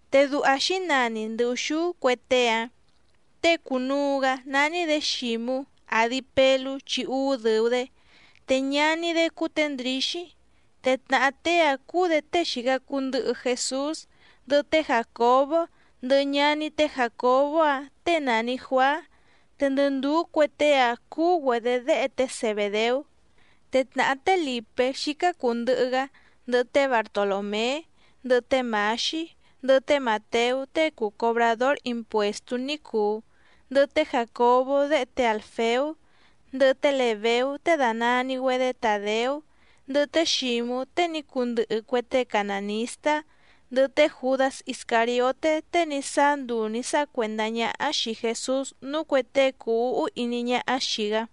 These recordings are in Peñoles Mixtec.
Te duha xǐnani ndɨ ùxúú cue tée‑áⁿ: tée cùnuu‑gá nání‑dě Xǐmú, àdi Pelú chi úú dɨ̀u‑dé, te ñaní‑dé cúú tě Ndrǐxí, te tnàhá tée‑áⁿ cúú‑dě tée xìca cuu ndɨhɨ Jesús, ndɨhɨ té Jàcobó ndɨhɨ ñaní té Jàcobó‑áⁿ těe nàni Juaá, te ndɨ ndùú cue tée‑áⁿ cúú‑güedě déhe té Zebèdeú. Te tnàhá té Lìpé xícá cùu ndɨhɨ‑gá, ndɨhɨ té Bartolòmé, ndɨhɨ té Mǎxí, ndɨhɨ té Màteú tée cùu cobradór impuèstú ní cùu, ndɨhɨ té Jàcobó déhe té Àlfeú, ndɨhɨ té Lèbeú tée dànani‑güedé Tàdeú, ndɨhɨ té Xǐmú tée ní cundɨhɨ cue tée canànistá, ndɨhɨ té Jùdás Iscàrioté tée ní sáá nduu nǐ sáha cuèndá ñáhá xìi Jesús núú cuè tée cùu úhú iní ñáhá xìi‑gá.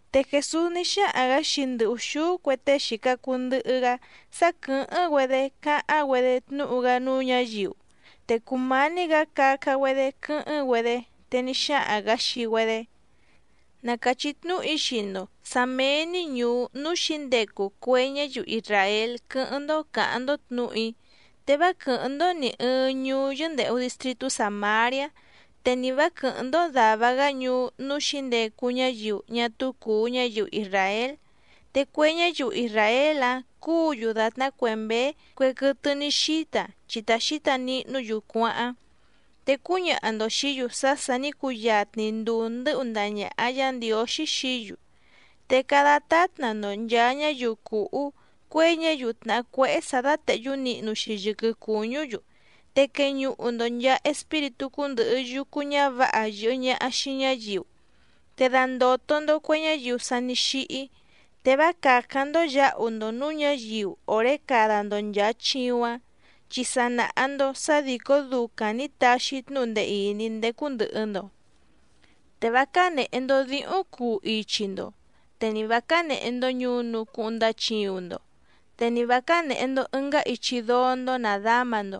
Te Jèsús ní xáhaⁿ‑gǎ xii ndɨ ùxúú cue tée xìca cuu ndɨhɨ‑gá sá quɨ̀hɨ́ⁿ‑güedé cáháⁿ‑güedé tnúhu‑gá núú ñǎyiu, te cùmání‑gǎ caca‑güedé quɨ́hɨ́ⁿ‑güedé, te ní xáhaⁿ‑gǎ xii‑güedé: —Na càchí tnúhu‑í xii‑ndo sǎ méé‑ní ñùú núú xǐndecu cue ñáyiu isràél quɨ́hɨ́ⁿ‑ndó cǎháⁿ‑ndó tnǔhu‑í, te vá quɨ̀hɨ́ⁿ‑ndó nì ɨɨⁿ ñuú yɨ́ndèhu distritú Sàmariá, te ni vǎ quɨ̀hɨ́ⁿ‑ndó dàva‑gá ñuú núú xǐndecu ñáyiu ñá túú cùu ñáyiu isràél. Te cue ñáyiu isràél‑áⁿ cúǔ‑yu dàtná cue mběé cue quɨtɨ ní xíta chi ta xǐta nihnú‑yu cuáháⁿ. Te cúñaha‑ndo xìí‑yu sá sà ní cuyatni nduu ndɨ́hu ndaha ñàha Yá Ndiǒxí xií‑yu. Te cada tátna‑ndo nchàa ñáyiu cùhú cuěi ñáyiu tnàhá cuéhé sǎ dátèhyú nihnu‑xi yɨquɨ cùñú‑yu, te queñuhu‑ndo nchàa espíritú cúndɨ̀hɨ yucu ñávǎha yɨ̀hɨ ñaha xii ñáyiu, te dandòto‑ndo cue ñáyiu sa ní xíhí, te vá càcáⁿ‑ndó yǎhu‑ndo nǔú ñǎyiu òré cada‑ndo nchàa chiuⁿ‑áⁿ, chi sa nàha‑ndo sá dìcó ducaⁿ nǐ taxi‑í tnúhu ndee ìní ndécú ndɨ̀hɨ‑ndo. ’Te vá cánèhe‑ndo díhúⁿ cuu ichi‑ndo, te ni vǎ cánèhe‑ndo ñunu cuhuⁿ ndachiuⁿ‑ndo, te ni vǎ cánèhe‑ndo ɨngá ichi dóó‑ndó nàdáma‑ndo,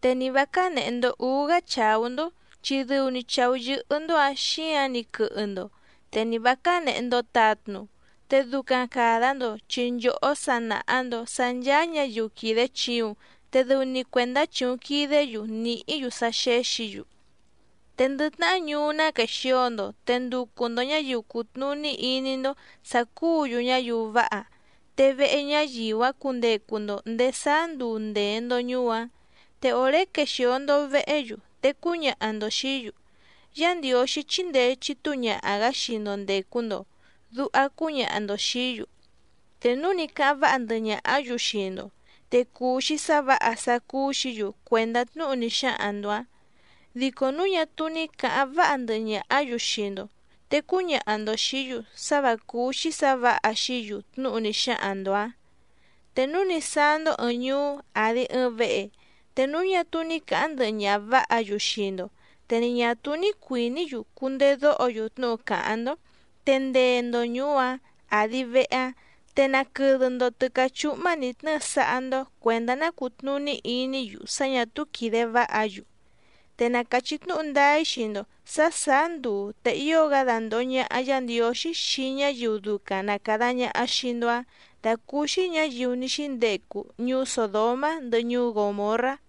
te ni vǎ cánèhe‑ndo úú‑gá chàú‑ndó chi dɨu‑ni chàú yɨ́hɨ́‑ndó‑ǎⁿ xíǎⁿ‑ni quɨhɨ‑ndo, te ni vǎ cánèhe‑ndo tatnu, te ducaⁿ càda‑ndo chi nchòhó sa nàha‑ndo sá ncháá ñǎyiu quìde chiuⁿ te dɨu‑ni cuèndá chìuⁿ quidé‑yu nìhí‑yu sá xéxǐ‑yu. ’Te ndɨ tnahá ñuú ná quèxio‑ndo te nducu‑ndo ñǎyiu cùtnuní iní‑ndó sǎ cúǔ‑yu ñáyiu váha, te vehe ñáyiu‑áⁿ cundecu‑ndo ndèé sáá nduu ndèe‑ndo ñuú‑áⁿ. Te òré quexìo‑ndo vehé‑yu te cúñaha‑ndo xìí‑yu: “Yá Ndiǒxí chíndèe chitúu ñaha‑gǎ xii‑ndo ndècu‑ndo”, duha cúñaha‑ndo xìí‑yu. Te núu ní cáháⁿ váha ndɨhɨ ñàhá‑yu xii‑ndo, te cuu‑xi sá vǎha sá cúú‑xǐ‑yu cuèndá tnúhu ní xáhaⁿ‑ndo‑ǎⁿ, dico núu ñá túú ní càháⁿ váha ndɨhɨ ñàhá‑yu xii‑ndo, te cúñaha‑ndo xìí‑yu sá vǎ cúú‑xí sǎ vǎha xií‑yu tnúhu ní xáhaⁿ‑ndo‑ǎⁿ. Te núu ní sáá‑ndó ɨ̀ɨⁿ ñuú àdi ɨɨⁿ vehe, te núu ñá túú ní cǎháⁿ ndɨhɨ ñaha vǎha‑yu xii‑ndo te ni ñà túú ní cuìní‑yu cundedóho‑yu tnúhu càháⁿ‑ndó te ndee‑ndo ñùú‑áⁿ àdi vehe‑áⁿ, te naquɨdɨ‑ndo tɨ̌cá chúhmá nǐ tnɨ́ɨ sáhá‑ndó cuèndá ná cùtnuní iní‑yu sá ñà túú quìde váha‑yu. Te na càchí tnúhu ndáá‑í xii‑ndo sǎ sàá nduu te ío‑gá dandòho ñaha Yá Ndiǒxí xii ñáyiu ducaⁿ na càda ñaha xii‑ndo‑áⁿ dàcúúxí ñǎyiu ní xíndecu ñuú Sòdomá ndɨhɨ ñuú Gòmorrá.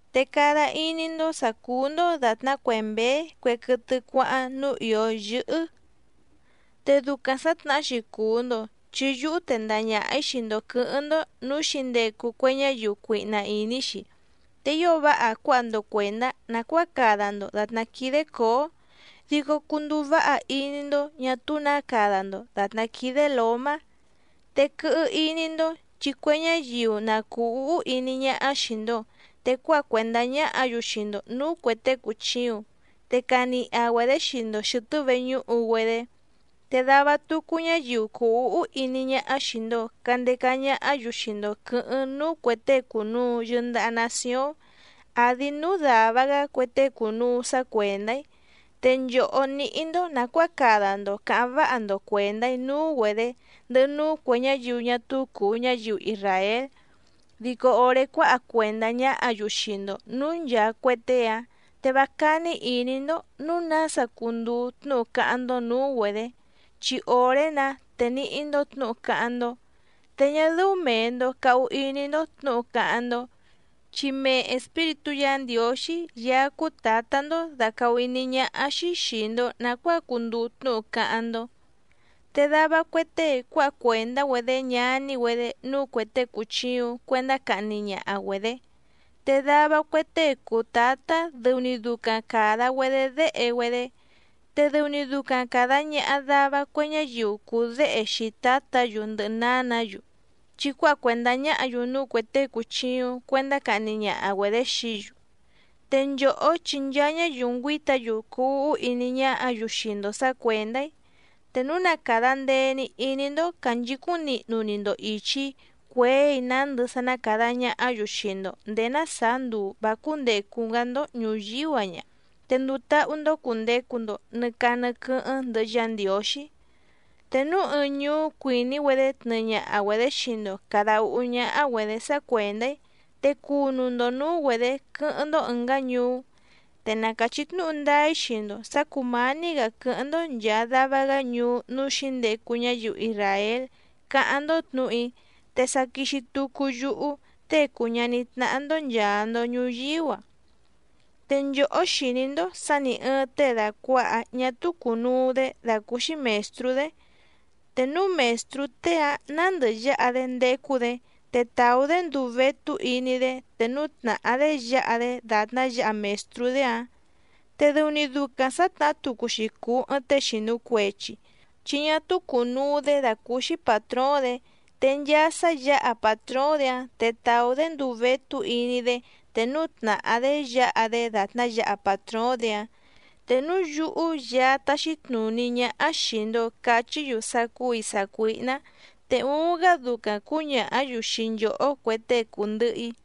’Te cada iní‑ndó sǎ cúú‑ndó dàtná cue mběé cue quɨtɨ cuáháⁿ núú ìó yɨ́hɨ́. Te ducaⁿ sǎtnahá‑xi cùu‑ndo chi yúhú tendaha ñaha‑ǐ xii‑ndo quɨ̌hɨ́ⁿ‑ndó nǔú xǐndecu cue ñáyiu cuihna ìní‑xi, te ío váha cuáha‑ndo cuèndá nàcuáa cada‑ndo dàtná quídé cǒó, dico cunduu váha iní‑ndó ñà túú nǎ cada‑ndo dàtná quídé lǒmá. Te quɨhɨ iní‑ndó chi cue ñáyiu na cùu úhú iní ñáhá xìi‑ndo, te cuáha cuèndá ñáhǎ‑yu xii‑ndo nǔú cuè tée cùchiuⁿ, te caniha‑güedě xii‑ndo xɨ̀tɨ́ veñúhu‑güedé. Te dava tucu ñáyiu cuu úhú iní ñáhá xìi‑ndo candeca ñahá‑yu xii‑ndo quɨ̌hɨ́ⁿ núú cuè tée cùnuu yɨndaha nacióⁿ, àdi núú dàva‑gá cue tée cùnuu sá cuèndá‑í. Te nchòhó níhí‑ndó nàcuáa cada‑ndo cǎháⁿ váha‑ndo cuèndá‑í núú‑güedě ndɨhɨ núú cuè ñáyiu ñá túú cùu ñáyiu isràél. Dico òré cuáha cuèndá ñáhǎ‑yu xii‑ndo nǔú nchàa cue tée‑áⁿ, te vá cání ìní‑ndó nǔu nása cunduu tnúhu cáháⁿ‑ndó nǔú‑güedě, chi òré‑nǎ te níhí‑ndó tnǔhu cáháⁿ‑ndó. Te ñá dɨ́ú mèe‑ndo cahu iní‑ndó tnǔhu cáháⁿ‑ndó, chi mee Espíritú Yǎ Ndiǒxí Yaá cúú Tǎtá‑ndó dàcahú iní ñáhá‑xí xìi‑ndo nacuáa cunduu tnúhu cáháⁿ‑ndó. ’Te dava cue tée cuáha cuèndá‑güedé ñaní‑güedé núú cuè tée cùchiuⁿ cuendá cahni ñaha‑güedě, te dava cue tée cùu tátá dɨu‑ni ducaⁿ càda‑güedé déhe‑güedé, te dɨu‑ni ducaⁿ càda ñaha dava cue ñáyiu cùu déhe xii tǎtǎ‑yu ndɨhɨ nǎnǎ‑yu, chi cuáha cuèndá ñáhǎ‑yu núú cuè tée cùchiuⁿ cuendá cahni ñaha‑güedě xií‑yu. Te nchòhó chi nchaa ñáyiu ngüíta‑yu cuu úhú iní ñáhǎ‑yu xii‑ndo sǎ cuèndá‑í. Te núu na càda ndee‑ni iní‑ndó cànchicúⁿ nihnu‑ni‑ndo ìchi‑í cuěi nándɨ sá ná càda ñahá‑yu xii‑ndo ndèé ná sàá nduu vǎ cúndècu‑gá‑ndó ñùyíú‑a ña, te nduu táhú‑ndó cùndecu‑ndo nɨ caa nɨ quɨ́hɨ́ⁿ ndɨhɨ Yá Ndiǒxí. Te núu ɨɨⁿ ñuú cuìní‑güedé tnɨɨ ñaha‑güedě xii‑ndo càda úhú ñáhá‑güedě sá cuèndá‑í, te cunu‑ndo nǔú‑güedě quɨ́hɨ́ⁿ‑ndó ɨ̀ngá ñuú. Te na càchí tnúhu ndáá‑í xii‑ndo sǎ cùmání‑gǎ quɨ́hɨ́ⁿ‑ndó nchàa dava‑gá ñuú núú xǐndecu ñáyiu isràél cáháⁿ‑ndó tnǔhu‑í, te sa quixi tucu yúhú, Tée cùu ñaní tnáhá‑ndó nchàa‑ndo ñuyíú‑a. ’Te nchòhó xìní‑ndó sǎ nì ɨɨⁿ tée dàcuaha ñá túú cùnuu‑dé dàcúúxí mèstrú‑dé, te núu mèstrú tée‑áⁿ nǎndɨ yǎha‑dé ndécú‑dě te tàú‑dé nduu vétú iní‑dé te núu tnàhá‑dé yǎha‑dé dàtná yǎha mèstrú‑dé‑áⁿ. Te dɨu‑ni ducaⁿ sǎtnahá tucu‑xi cùu ɨɨⁿ tée xìnu cuechi, chi ñá túú cùnuu‑dé dàcúúxí pàtróóⁿ‑dě, te nchaa sá yǎha pàtróóⁿ‑dě‑áⁿ te tàú‑dé nduu vétú iní‑dé te núu tnàhá‑dé yǎha‑dé dàtná yǎha pàtróóⁿ‑dě‑áⁿ. Te núu yúhú Yaá táxí tnùní ñáhá xìi‑ndo cachí‑yu sá cúù‑í sácuíhná, te uuⁿ‑gá ducaⁿ cǔñàhá‑yu xii nchòhó cue tée cùndɨhɨ‑í.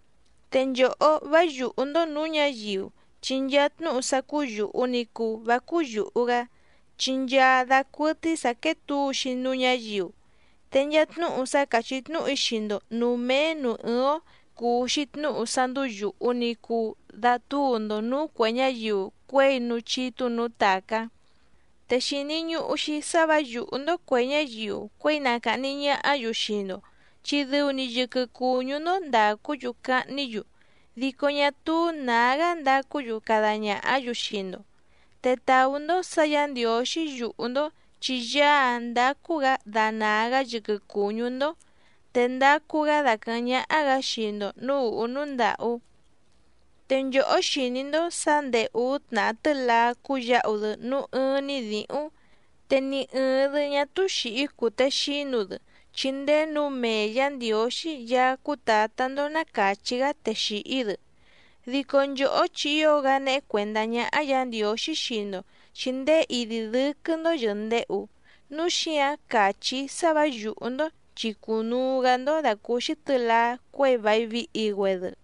’Te nchòhó vá yùhú‑ndó nǔú ñǎyiu. Chi nchaa tnúhu sá cúú yùhu ni cuu vá cúú yùhu‑gá, chi nchaa dacuɨtɨ́í sǎ quéé tǔu‑xi núú ñǎyiu. Te nchaa tnúhu sá càchí tnúhu‑í xii‑ndo nǔú méé nǔú ɨ́ɨ́ⁿ‑ó, cùu‑xi tnúhu sá ndúú yùhu ni cuu datúu‑ndo nǔú cuè ñáyiu cuěi núú chítú nǔú tàcá. Te xìni ñuhu‑xi sá vǎ yùhú‑ndó cuè ñáyiu cuěi na càhni ñahá‑yu xii‑ndo, chi dɨu‑ni yɨquɨ cùñú‑ndó ndàcú‑yu cahní‑yu, dico ñá túú nǎgá ndacú‑yu cada ñàhá‑yu xii‑ndo. Te tàú‑ndó sǎ Yǎ Ndiǒxí yùhú‑ndó chi Yaá‑áⁿ ndacu‑gá danàa‑gá yɨquɨ cùñú‑ndó, te ndacu‑gá daquɨ̀hɨ́ⁿ ñáhá‑gǎ xii‑ndo nǔú ùhú núú ndàhú. ’Te nchòhó xìní‑ndó sǎ ndèé úú tnàhá tɨ́laá cúyǎhu‑dɨ núú ɨ́ɨ́ⁿ‑ní dǐhúⁿ, te ni ɨ̀ɨⁿ‑dɨ ñá túú xìhí cùtexínu‑dɨ chi ndéé nǔu mee Yǎ Ndiǒxí Yaá cúú Tǎtá‑ndó ná càchí‑gá te xìhí‑dɨ. Dico nchòhó chi ío‑gá néhé cuèndá ñáhá Yǎ Ndiǒxí xii‑ndo chi ndéé idi dɨ́quɨ́‑ndó yɨ̀ndehu. Núu xíǎⁿ càchí‑í sá vǎ yùhú‑ndó chi cùnuu‑gá‑ndó dàcúúxí tɨ̌laá cuěi vài vihi‑güedɨ.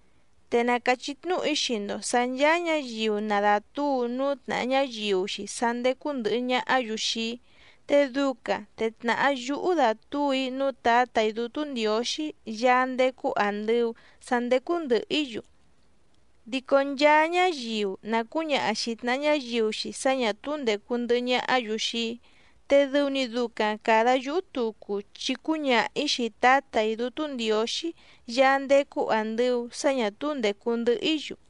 ’Te na càchí tnúhu‑í xii‑ndo sǎ ncháá ñǎyiu na dàtúu núú tnàha ñáyiu‑xi sá ndécú ndɨ̀hɨ ñahá‑yu xii‑í, te ducaⁿ te tnàhá yúhú dàtúu‑í núú Tǎtà‑í Dútú Ndiǒxí Yaá ndécú àndɨu sá ndécú ndɨ̀hɨ‑í‑yu. Dico nchaa ñáyiu na cǔñaha xìi tnaha ñáyiu‑xi sá ñà túú ndècu ndɨhɨ ñahá‑yu xii‑í, te dɨu‑ni ducaⁿ càda yúhú tucu chi cúñaha‑ǐ xii Tǎtà‑í Dútú Ndiǒxí Yaá ndécú àndɨu sá ñà túú ndècu ndɨhɨ‑í‑yu.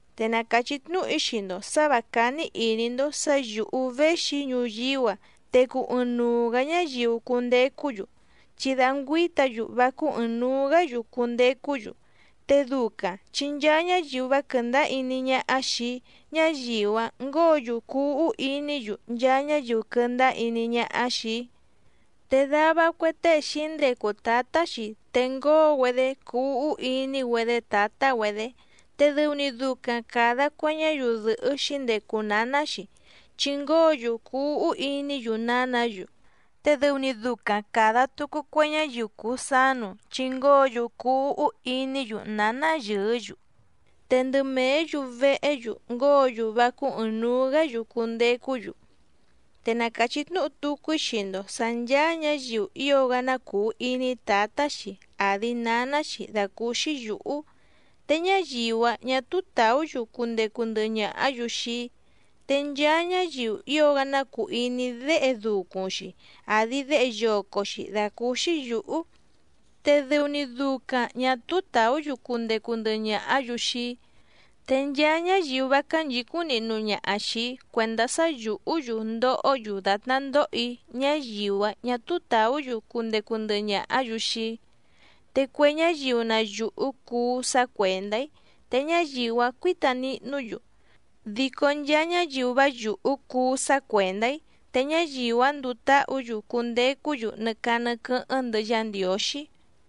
’Te na càchí tnúhu‑í xii‑ndo sǎ vǎ cání ìní‑ndó sǎ yǔhú véxi‑í ñuyíú‑a te cuu ɨɨⁿnuu‑gǎ ñáyiu cundecú‑yu, chi da ngüǐta‑yu vá cúú ɨ̀ɨⁿnuu‑gá‑yu cundecú‑yu, te ducaⁿ chi nchaa ñáyiu vá quɨ̀ndáá iní ñáhá xìi‑í ñáyiu‑áⁿ ngǒo‑yu cuu úhú iní‑yu nchaa ñáyiu quɨndáá iní ñáhá xìi‑í. Te dava cue tée xǐndecu tǎtá‑xi te ngóo‑güedé cuu úhú iní‑güedé tǎtá‑güedě, te dɨu‑ni ducaⁿ càda cue ñáyiu dɨ̀hɨ́ xǐndecu nǎná‑xi, chi ngóo‑yu cuu úhú iní‑yu nǎnǎ‑yu, te dɨu‑ni ducaⁿ càda tucu cue ñáyiu cùu sánu, chi ngóo‑yu cuu úhú iní‑yu nǎná yɨɨ́‑yu. Te ndɨ mèé‑yu vehé‑yu ngóo‑yu vá cúú ɨ̀ɨⁿnuu‑gá‑yu cundecú‑yu. ’Te na càchí tnúhu tucu‑í xii‑ndo sǎ ncháá ñǎyiu ío‑gá ná cùu iní tǎtá‑xi àdi náná‑xi dàcúúxí yǔhú, te ñáyiu‑áⁿ ñà túú tàú‑yu cundecu ndɨhɨ ñàhá‑yu xii‑í, te nchaa ñáyiu ío‑gá ná cùu iní déhe ducuⁿ‑xi, àdi déhe yoco‑xi dàcúúxí yǔhú, te dɨu‑ni ducaⁿ ñà túú tàú‑yu cundecu ndɨhɨ ñàhá‑yu xii‑í. Te nchaa ñáyiu vá cánchǐcúⁿ nihnu ñaha xìi‑í cuèndá sá yùhú‑yu ndohó‑yu dàtná ndoho‑í ñáyiu‑áⁿ ñà túú tàú‑yu cundecu ndɨhɨ ñàhá‑yu xii‑í. Te cue ñáyiu na yùhú cuú sá cuèndá‑í te ñáyiu‑áⁿ cuǐta nihnú‑yu, dico nchaa ñáyiu vá yùhú cuú sá cuèndá‑í, te ñáyiu‑áⁿ nduu táhǔ‑yu cundecú‑yu nɨ caa nɨ quɨ́hɨ́ⁿ ndɨhɨ Yá Ndiǒxí.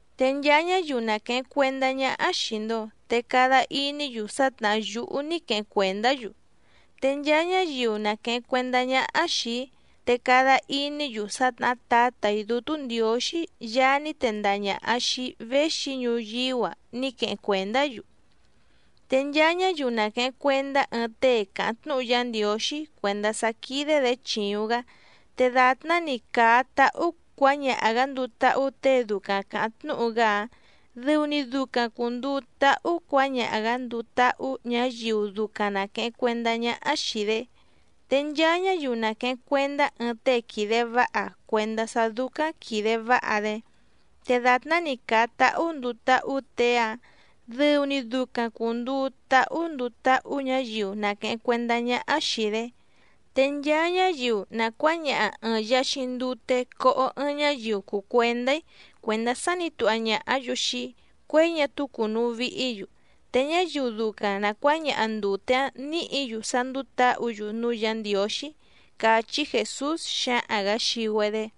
’Te nchaa ñáyiu na quèheⁿ cuendá ñáhá xìi‑ndo te cada iní‑yu sá tnàhá yúhú ní queheⁿ cuèndá‑yu. Te nchaa ñáyiu na quèheⁿ cuendá ñáhá xìi‑í, te cada iní‑yu sá tnàhá Tǎtà‑í Dútú Ndiǒxí Yaá ní tendaha ñàha xii‑í véxi‑í ñuyíú‑a ní queheⁿ cuèndá‑yu. Te nchaa ñáyiu na quèheⁿ cuendá ɨɨⁿ tée càháⁿ tnúhu Yá Ndiǒxí cuèndá sá quídé‑dě chìuⁿ‑gá, te dàtná‑ni càa táhú cuǎñaha‑gǎ nduu táhú těe ducaⁿ càháⁿ tnúhu‑gá‑áⁿ, dɨu‑ni ducaⁿ cùnduu táhú cuǎñaha‑gǎ nduu táhú ñǎyiu ducaⁿ na quèheⁿ cuendá ñáhá xìi‑dé. Te nchaa ñáyiu na quèheⁿ cuendá ɨɨⁿ tée quìde váha cuèndá sá dúcáⁿ quìde váha‑dé, te dàtná‑ni càa táhú nduu táhú těe‑áⁿ dɨu‑ni ducaⁿ cùnduu táhú nduu táhú ñǎyiu na quèheⁿ cuendá ñáhá xìi‑dé. Te nchaa ñáyiu na cuǎñaha ɨ̀ɨⁿ yaxiⁿ ndute coho ɨɨⁿ ñáyiu cùu cuendá‑í cuèndá sá nǐ tuha ñàhá‑yu xii‑í cuěi ñá túú cùnuu vihí‑yu, te ñáyiu ducaⁿ na cuǎñaha ndùte‑áⁿ nǐhǐ‑yu sá ndúú tǎhǔ‑yu núú Yǎ Ndiǒxí —càchí Jèsús xǎhaⁿ‑gǎ xii‑güedé.